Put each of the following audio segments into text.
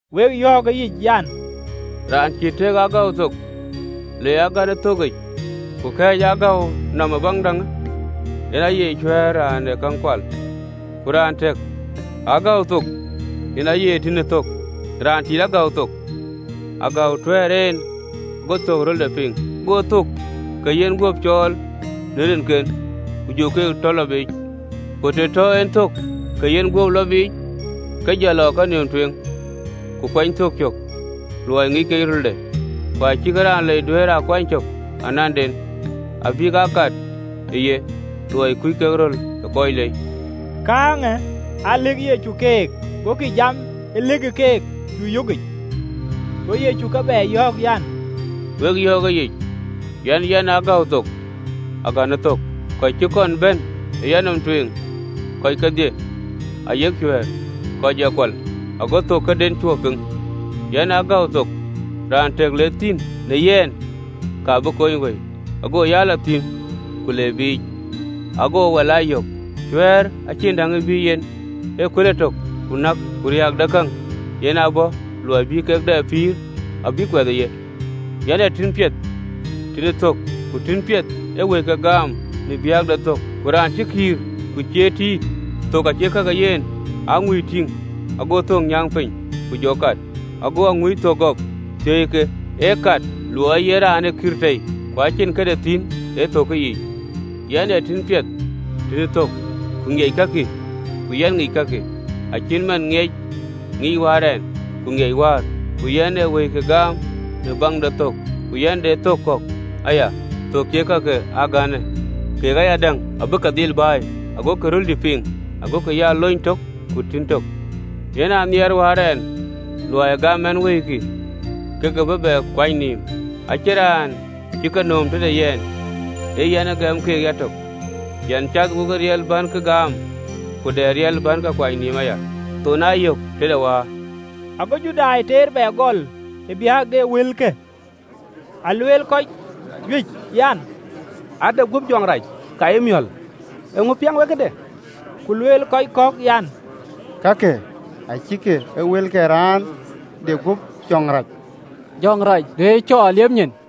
Wek yɔ̈ɔ̈k ë yic an, “Raan cïï tëk ë agäu thok le agän ë thökkic, ku kɛɛc ë gäu nɔm ë baŋ däŋ, yen aye cuɛ̈ɛ̈r, raan ë käŋ kual. Ku raan tëk ë agäu thok, yen aye tïn ë thök. Raan tit agäu thok ee agäu tuɛ̈ɛ̈r en, go thök rölde piŋ: go thök ke yenguöp cɔɔl në rinken, ku jɔ ke tɔ lɔ biic. Ku të tɔ en thök ke yenguöp lɔ biic, ke jɔ lɔ ë kenïïm tueŋ, ku kuɛny thök cök, luɔi ŋic kek rölde. Ku acïkï raan lei duëër aa kuany cök ananden, abïk aa kat ëye, luɔi kuc kek röl ë kɔc lei.” Kääŋë aa lëkë Yecu keek: gokï jam ë lëk keek cuö yökic. Go Yecu ke bɛ yɔ̈ɔ̈k an, “Wek yɔ̈ɔ̈k ëyic an, Yɛn ee agäu thok, agäu ë thök. Kɔc cï kɔn bɛ̈n ë yanɔm tueŋ kɔc kedhie, ayek cuɛ̈ɛ̈r, kɔc ee kual, ago thök këden cuö piŋ. Yɛn ee agäu thok: raan tëk le thïn në yɛn, ka bï kony wëi, go ya lɔ thïn ku le biic, ago wal aa yök. Cuɛ̈ɛ̈r acïn däŋ ee bïï yen, ee kuël etök, ku nääk, ku riääk de käŋ: yɛn aa bɔ̈ luɔi bï kek dɛ pïïr, abïk kuɛth ë ye. Yɛn ee tïn piɛth tïn ë thök: ku tïn piɛth ee wëike gaam në baŋ de thök. Ku raan cï kïïr, ku cie tït, thök acïkï ee ka ke yen, ee aŋuï tïŋ, go thök nyääŋ piny, ku kɔt, go aŋuï thök gɔp, thiëi ke: ee kat, luɔi ee yen raan ë kïïr tei, ku acïn këde thïn ë thök yiic. 14-15.Yɛn ee tïn piɛth, tïn ë thök, ku ŋiɛc kakï, ku yɛn ŋic kakï, acït man ŋic ë Wäär yɛn, ku ŋiɛc Wäär, ku yɛn ee wëikï gaam në baŋ de thök. Ku yɛn de thök kɔ̈k cie ka ke a gänë: kek ayadäŋ abä ke dhil bɛ̈ɛ̈i, agokï röldï piŋ, agokï ya luny tök, ku tïn tök. Yen a nhiɛɛrë Wäär ɛn, luɔi gam ɛn wëikï, ke ke bä bɛ kuany nïïm. Acïn raan cï ke nööm tëde yɛn, ee yɛn ë gɛm keek yatök. Yɛn cath wo riɛl bän ke gaam, ku dɛ riɛl bän ke kuany nïïm aya. Thönë aa yɔ̈k tëde wäär.” Ago Judai teer bɛ gɔl ë biäk de wëlkë. Aa lueel kɔc juëc an, “Ade guöp jɔŋ rac! Ka ye miɔ̈l! Eeŋö piɛŋ wek këde?” Ku lueel, kɔc kɔ̈k an, “Kakë acïkï ee wël ke raan de guöp jɔŋ rac. Jɔŋ rac duëër cɔɔr liep nyin?”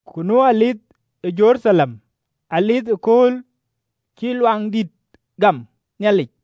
Ku nu dhuëëŋ ë Jeruthalem, Dhuëëŋ de kööl cïï Luaŋdït gäm Nhialic: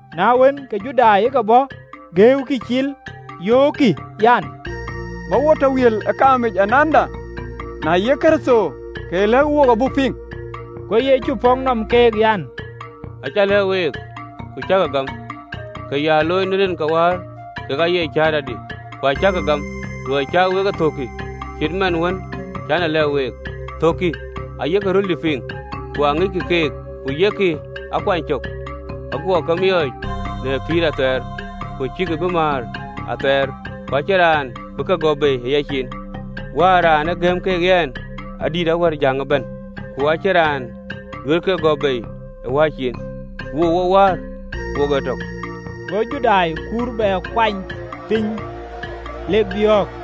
Na wën, ke Judai ke ke bɔ̈ geeukï cil, yöökkï an, “Bä wo tɔ wiël ë kaamic ananda? Na yee Kërtho, ke lɛ̈kë wook abuk piŋ.” Go Yecu pɔ̈k nɔm keek an, “Acä lɛ̈k week, ku cäkï gam: ka ya looi në rin ke Wäär, kek aye cäätɔdï. Ku acäkï gam, luɔi cä wek e thökkï, cït man wën cän e lɛ̈k week. Thökkï ayek röldï piŋ, ku aŋiɛc keek, ku yek a kuany cök: aguɔ ke miɔɔc në pïïr athɛɛr, ku acïkï bï määr athɛɛr, ku acïn raan bï kek gɔ̈p bei ë yaciin. Wäär, raan ë gëm ke yɛn, adït awär jäŋ ëbɛ̈n: ku acïn raan duëër ke gɔ̈p bei ë Wäär ciin. Wook wokë Wäär wok ee tök.” Go Judai kur bɛ kuany piny, lek biɔ̈ɔ̈k.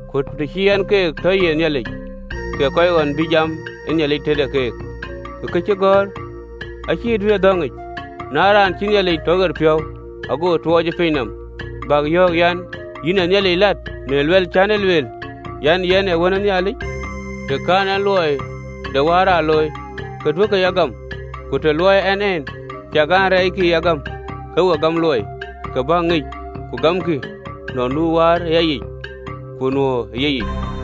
Ku të cï en keek tɔ ye yiëth, kek kɔc ɣɔn bïï jam ë Nhialic tëde keek (ku këcïgɔ̈ɔ̈r acï duëërë dhɔ̈ŋic). Na raan cïï Nhialic tɔ ɣer piɔ̈u, ago tuɔɔc ë piny nɔm, bäk yɔ̈ɔ̈k an, “Yïn ë Nhialic lat, në luɛ̈l cän e lueel an, Yɛn ee Wën ë Nhialic? Të kɛ̈n ɛn luɔi de Wäär aa looi, duökï ya gam. Ku të luɔɔi ɛn en, ciɛk an, rɛɛckï ya gam, ke we gam luɔi, ke bäk ŋic, ku gamkï, nɔn nu Wäär ë yayic, ku nuö ë yeyic.”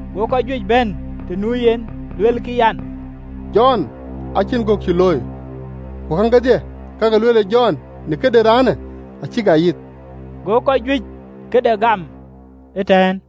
Go kɔc juëc bɛ̈n të nu yen luelkï an, “Jɔn acïn gök cï looi: ku käŋ kedhie kak ë lueelë Jɔn në këde raanë acïk aa yith.” Go kɔc juëc këde gam ëtɛ̈ɛ̈n.